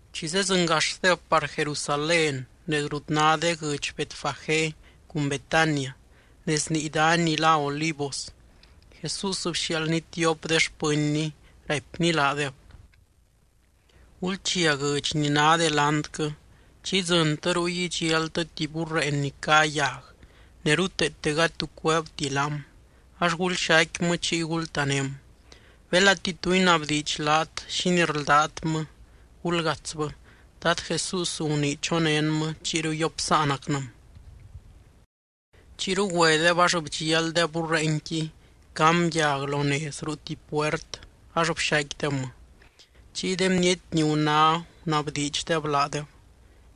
Chi zedzɨngaxdeb par Jerusalén nez rut ná de guɨdx Betfagé cun Betania nez nii dany ni lá Olivos, Jesús bxiaaldny tiop de xpɨnny, raipny laadeb: —Gulchia guɨdx ni ná delantquɨ. Chi idzɨntɨ ruy, idxialtɨ tuby burreen ni cá yag ne ruteete gady tu cueebti laam, ax gulxaicquimɨ chiy gultaném. Belati tu inabdiidx laat, xínii rldátmɨ, gulgatsbɨ, Dad Jesús gunii chonénmɨ chiyru yopsáanacnɨm. Chiyru güedeb, ax bdxialdeb burreenqui cam yag lo nez ruu tuby puert ax bxaicquidebmɨ. Chiy de bniety ni guná, gunabdiidxdeb laadeb: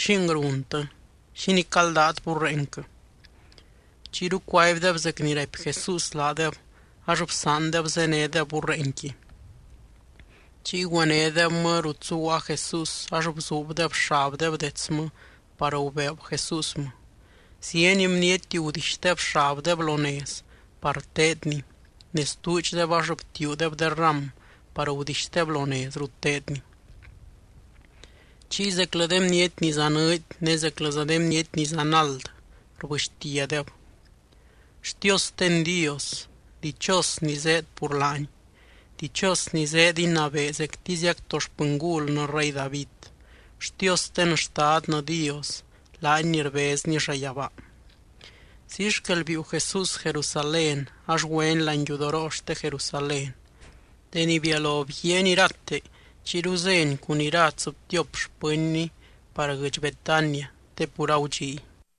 —¿Xing runtɨ? ¿Xínii caldát burreenquɨ? Chiyru cuaibdeb zec ni raipy Jesús laadeb, ax bsaandeb zénedeb burreenqui. Chiy güenédebmɨ rut zuguaa Jesús ax bzuubdeb xabdeb detsmɨ par gubeeb Jesúsmɨ. Zieny bniety gudixdeb xabdeb lo nez par teedny ne stuudxdeb ax btiuudeb de ram par gudixdeb lo nez rut teedny. Chiy zeclɨ de bniety ni zanɨɨdy ne zeclɨza de bniety ni zanald rbɨxtiadeb: —¡Xtiosten Dios! ¡Dichos ni zéed pur laany! ¡Dichos ni zéed inabee zectiziac to xpɨngulnɨ rey David! ¡Xtiosten Xtadnɨ Dios, laany ni rbezny llayabaa! Ziy xquel biiu Jesús Jerusalén ax güeny láani yudoroo xte Jerusalén. Deni bialo bguiaany irate, chiyru zény cun ira tsɨbtiop xpɨnny par guɨdx Betania te pur agudxiy.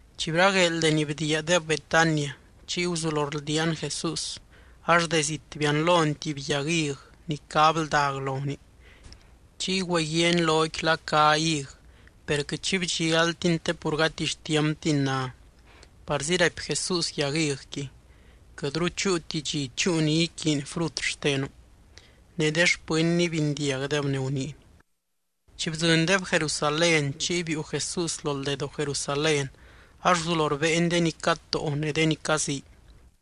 Chi bragueel deni bdiiadeb Betania, chiy guzulo rldiaan Jesús. Ax de zit bianlony tuby yag hig ni cá bldag lonii. Chiy güeguiaany loqui la cá hig, per quɨt xi bdxialtiny te pur gati xtiamptini ná. Parzi raipy Jesús yag higqui: —Quɨtru chúuti dxi chúu ni iquiiny frut xtenu. Ne de xpɨnny bindiagdeb ni guniiny. Chi bdzɨndeb Jerusalén chiy biiu Jesús lo ldedoo Jerusalén, ax guzulo rbéeny de ni catóo ne de ni cazii.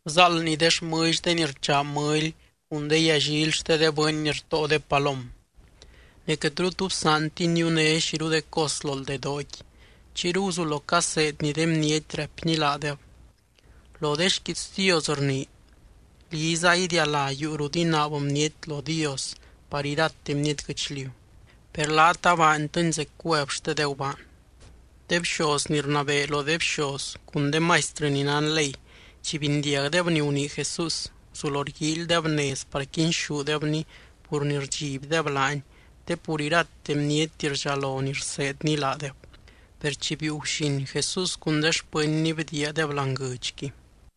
Bzáaldny de xmɨlly de ni rchaa mɨly cun de yallily xte de bɨny ni rtóo de palom. Ne quɨtru tu bsaantiny niuné xiru de cos lo ldedooqui. Chiyru guzulo caseedny de bniety, raipny laadeb: —Lo de xquiits Dios rnii: “Liza idialá yuu rut inaab bniety lo Dios par irate bniety guɨchliu.” Per laat abaantɨni zec cuev xte de gubaan. De bxoz ni rnabee lo de bxoz cun de maistrɨ ni nán ley, chi bindiagdeb ni gunii Jesús, guzulo rguíilydeb nez par quinxúdebny pur ni rdxibdeb laany te pur irate bniety rdxalo ni rseedny laadeb. Per chi biiu guxin, Jesús cun de xpɨnny bdiiadeb láani guɨdxqui.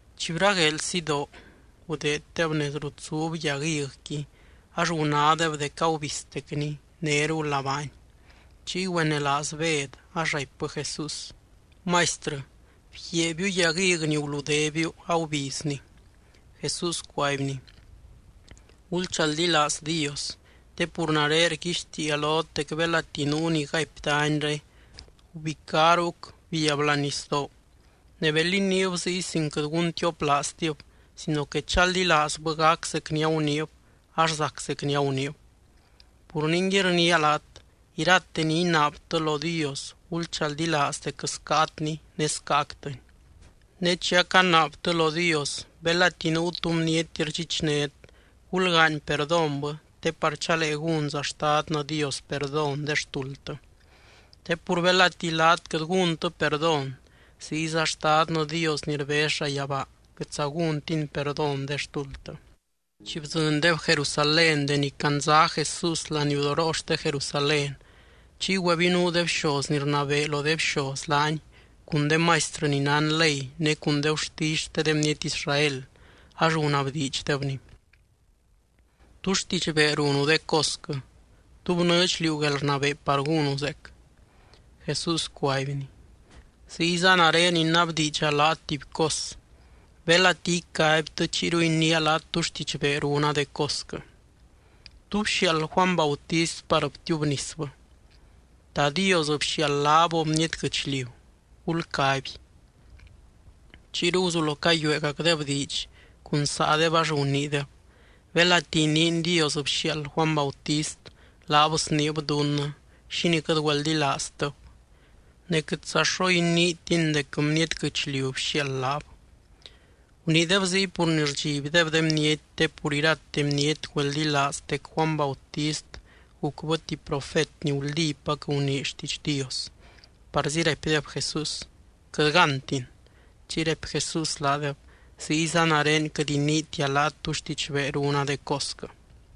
Chi bragueel sidoo, gudeeddeb nez rut zub yag higqui ax gunádeb dec agubiztecni, néru labaani. Chiy güenelaaz Bed ax raipbɨ Jesús: —Maistrɨ, bguiaabiu yag hig ni guludébiu agubizni. Jesús cuaibny: —Gulchaldilaaz Dios. Te pur nare rguixtiia lot dec belati nuu ni gaipy danyre: “Gubicá ruc, biab láani nisdoo”, ne bel iniib ziy sin quɨt guntioplaaztib sino que chaldilaazbɨ gac zec ni aguniib, ax zac zec ni aguniib. Pur ningui, rniia laat, irate ni inaabtɨ lo Dios, gulchaldilaaz dec scaatni, ne scaactɨni. Ne chi acanaabtɨ lo Dios, belati nuu tu bniety rdxichnét, gulgaany perdónbɨ te par chalee gúnza Xtadnɨ Dios perdón de xtuldtɨ. Te pur belati laat quɨt gúntɨ perdón, ziyza Xtadnɨ Dios ni rbez llayabaa quɨtza gúntiny perdón de xtuldtɨ. Chi bdzɨndeb Jerusalén deni candza Jesús laniudoroo xte Jerusalén, chiy güebinuu de bxoz ni rnabee lo de bxoz laany cun de maistrɨ ni nán ley ne cun de gurtisy xte de bniety Israel, ax gunabdiidxdebny: —¿Tú xtidxbee runu de cosquɨ? ¿Tú bnɨɨdx liú guelrnabee par gúnu zeec? Jesús cuaibny: —Ziyza nare inabdiidxa laat tuby cos. Belati icaibtɨ, chiyru iniia laat tú xtidxbee runa de cosquɨ. ¿Tú bxiaald Juany Bautist par btiubnisbɨ? ¿Ta Dios bxiaald laab o bniety guɨchliu? Gulcaby. Chiyru guzulo cayuegacdeb diidx cun saadeb, ax guniideb: —Belati iniin Dios bxiaald Juany Bautist, laab sniib dunnɨ: “¿Xínii quɨt güeldilaaztɨb?” Ne quɨtza xo iniitin dec bniety guɨchliu bxiaald laab. Guniideb ziy pur ni rdxibdeb de bniety, te pur irate bniety güeldilaaz dec Juany Bautist gucbɨ tuby profet ni guldípac gunii xtiidx Dios. Parzi raipdeb Jesús: —Quɨt gántin. Chiy raipy Jesús laadeb: —Ziyza nare quɨt iniitia laat tú xtidxbee runa de cosquɨ.